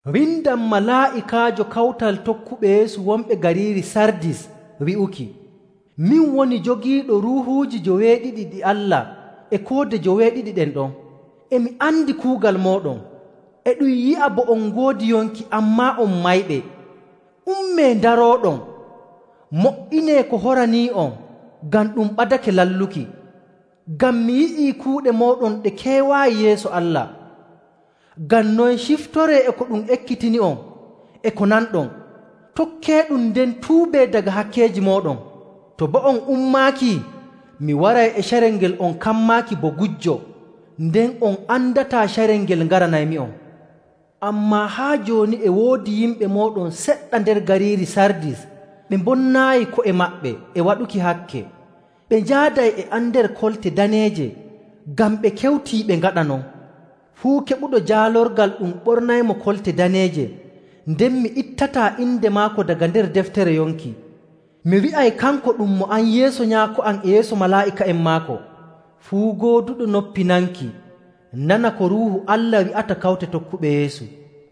“Windan malaa'ikaajo kawtal tokkuɓe Yeesu wonɓe gariiri Sardis wi'uki: “Min woni jogiiɗo Ruuhuuji joweeɗiɗi ɗi Allah e koode joweeɗiɗi ɗen ɗon. E mi andi kuugal mooɗon, e ɗum yi'a bo on ngoodi yonki, ammaa on mayɓe. Ummee, ndarooɗon! Mo''inee ko horanii'on ngam ɗum ɓadake lalluki, ngam mi yi'ii kuuɗe mooɗon ɗe keewaayi yeeso Allah. Ngam non ciftoree e ko ɗum ekkitini'on e ko nanɗon, tokkeeɗum nden tuubee daga hakkeeji mooɗon. To boo on ummaaki, mi waray e carel ngel on kammaaki bo gujjo. Nden on andataa carel ngel ngaranaymi'on. Ammaa haa jooni e woodi yimɓe mooɗon seɗɗa nder gariiri Sardis ɓe mbonnaayi ko'e maɓɓe e waɗuki hakke. Ɓe njaaday e am nder kolte daneeje ngam ɓe kewtii ɓe ngaɗa non. Fuu keɓuɗo jaalorgal ɗum ɓornaymo kolte daneeje, nden mi ittataa inde maako daga nder deftere yonki. Mi wi'ay kanko ɗum mo am yeeso Nyaako am e yeeso malaa'ika'en maako. “Fuu gooduɗo noppi nanki nana ko Ruuhu Allah wi'ata kawte tokkuɓe Yeesu.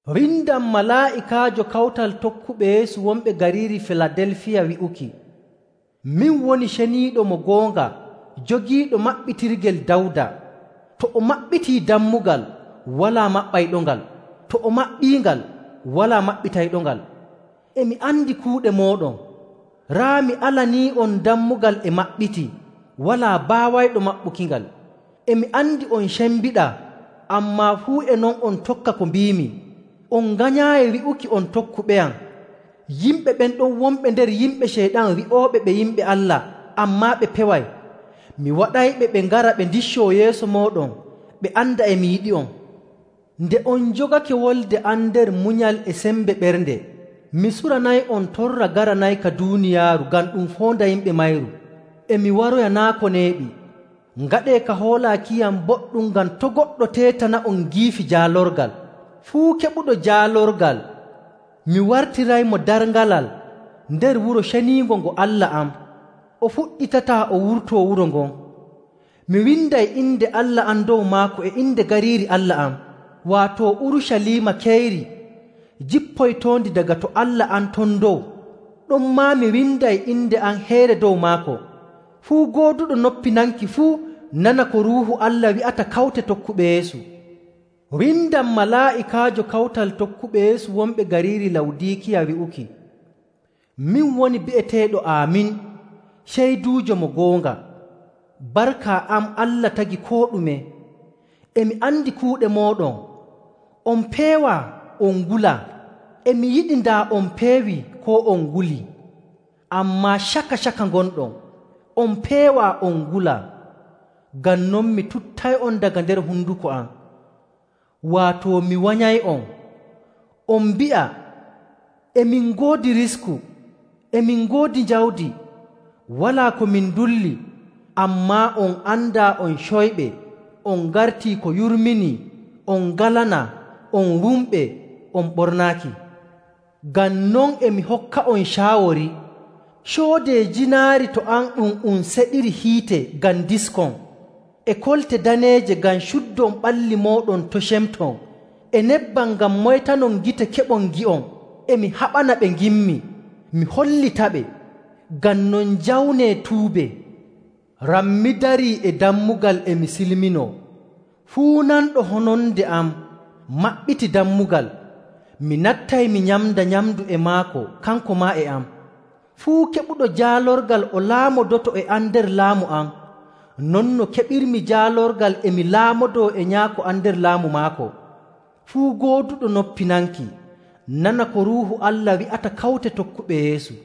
“Windan malaa'ikaajo kawtal tokkuɓe Yeesu wonɓe gariiri Filadelfiya wi'uki: “Min woni Ceniiɗo mo goonga jogiiɗo maɓɓitirgel Dawda. To o maɓɓitii dammugal, walaa maɓɓayɗongal, to o maɓɓiingal, walaa maɓɓitayɗongal. E mi andi kuuɗe mooɗon. Raa mi alanii'on dammugal e maɓɓitii, walaa baawayɗo maɓɓukingal. E mi andi on cembiɗaa, ammaa fuu e non on tokka ko mbiimi, on nganyaayi wi'uki on tokkuɓeyam. Yimɓe ɓen ɗon wonɓe nder yimɓe Ceyɗan wi'ooɓe ɓe yimɓe Allah ammaa ɓe peway, mi waɗayɓe ɓe ngara ɓe ndiccoo yeeso mooɗon ɓe anda e mi yiɗi'on. Nde on njogake wolde am nder munyal e sembe ɓernde, mi suranay'on torra garanayka duuniyaaru ngam ɗum foonda yimɓe mayru. E mi waroya naa' ko neeɓi. Ngaɗee ka hoolaakiyam boɗɗum ngam to' goɗɗo teetana'on giifi jaalorgal. Fuu keɓuɗo jaalorgal mi wartiraymo darŋalal nder wuro ceniingo ngo Allah am, o fuɗɗitataa o wurtoo wuro ngon. Mi winday inde Allah am dow maako e inde gariiri Allah am, waato Urucaliima keyri jippoytoondi daga to Allah am ton dow. Ɗonmaa mi winday inde am heyre dow maako. “Fuu gooduɗo noppi nanki fuu nana ko Ruuhu Allah wi'ata kawte tokkuɓe Yeesu. “Windan malaa'ikaajo kawtal tokkuɓe Yeesu wonɓe gariiri Lawdiikiya wi'uki: “Min woni bi'eteeɗo Aamin, ceyduujo mo goonga, barka am Allah tagi koo ɗume. E mi andi kuuɗe mooɗon, on peewaa on ngulaa. E mi yiɗi daa on peewii koo on ngulii! Ammaa caka‑caka ngonɗon, on peewaa on ngulaa. Ngam non mi tuttay'on daga nder honduko am, waato mi wanyay'on. On mbi'a, ‘E min ngoodi risku. E min ngoodi jawdi, walaa ko min ndulli.’ Ammaa on andaa on coyɓe on ngartii ko yurminii, on ngalanaa, on wumɓe, on ɓornaaki. Ngam non e mi hokka'on caawori. Coodee jiinaari to am ɗum um seɗiri hiite ngam ndiskon, e kolte daneeje ngam cuddon ɓalli mooɗon to' cemton, e nebbam ngam moytanon gite keɓon ngi'on. E mi haɓana ɓe nginmi, mi hollitaɓe. Ngam non njawnee tuubee. Rammi darii e dammugal e mi silminoo. Fuu nanɗo hononde am, maɓɓiti dammugal, mi nattay mi nyamda nyamndu e maako kanko maa e am. Fuu keɓuɗo jaalorgal o laamodoto e am nder laamu am, non no keɓirmi jaalorgal e mi laamodoo e Nyaako am nder laamu maako. “Fuu gooduɗo noppi nanki nana ko Ruuhu Allah wi'ata kawte tokkuɓe Yeesu!”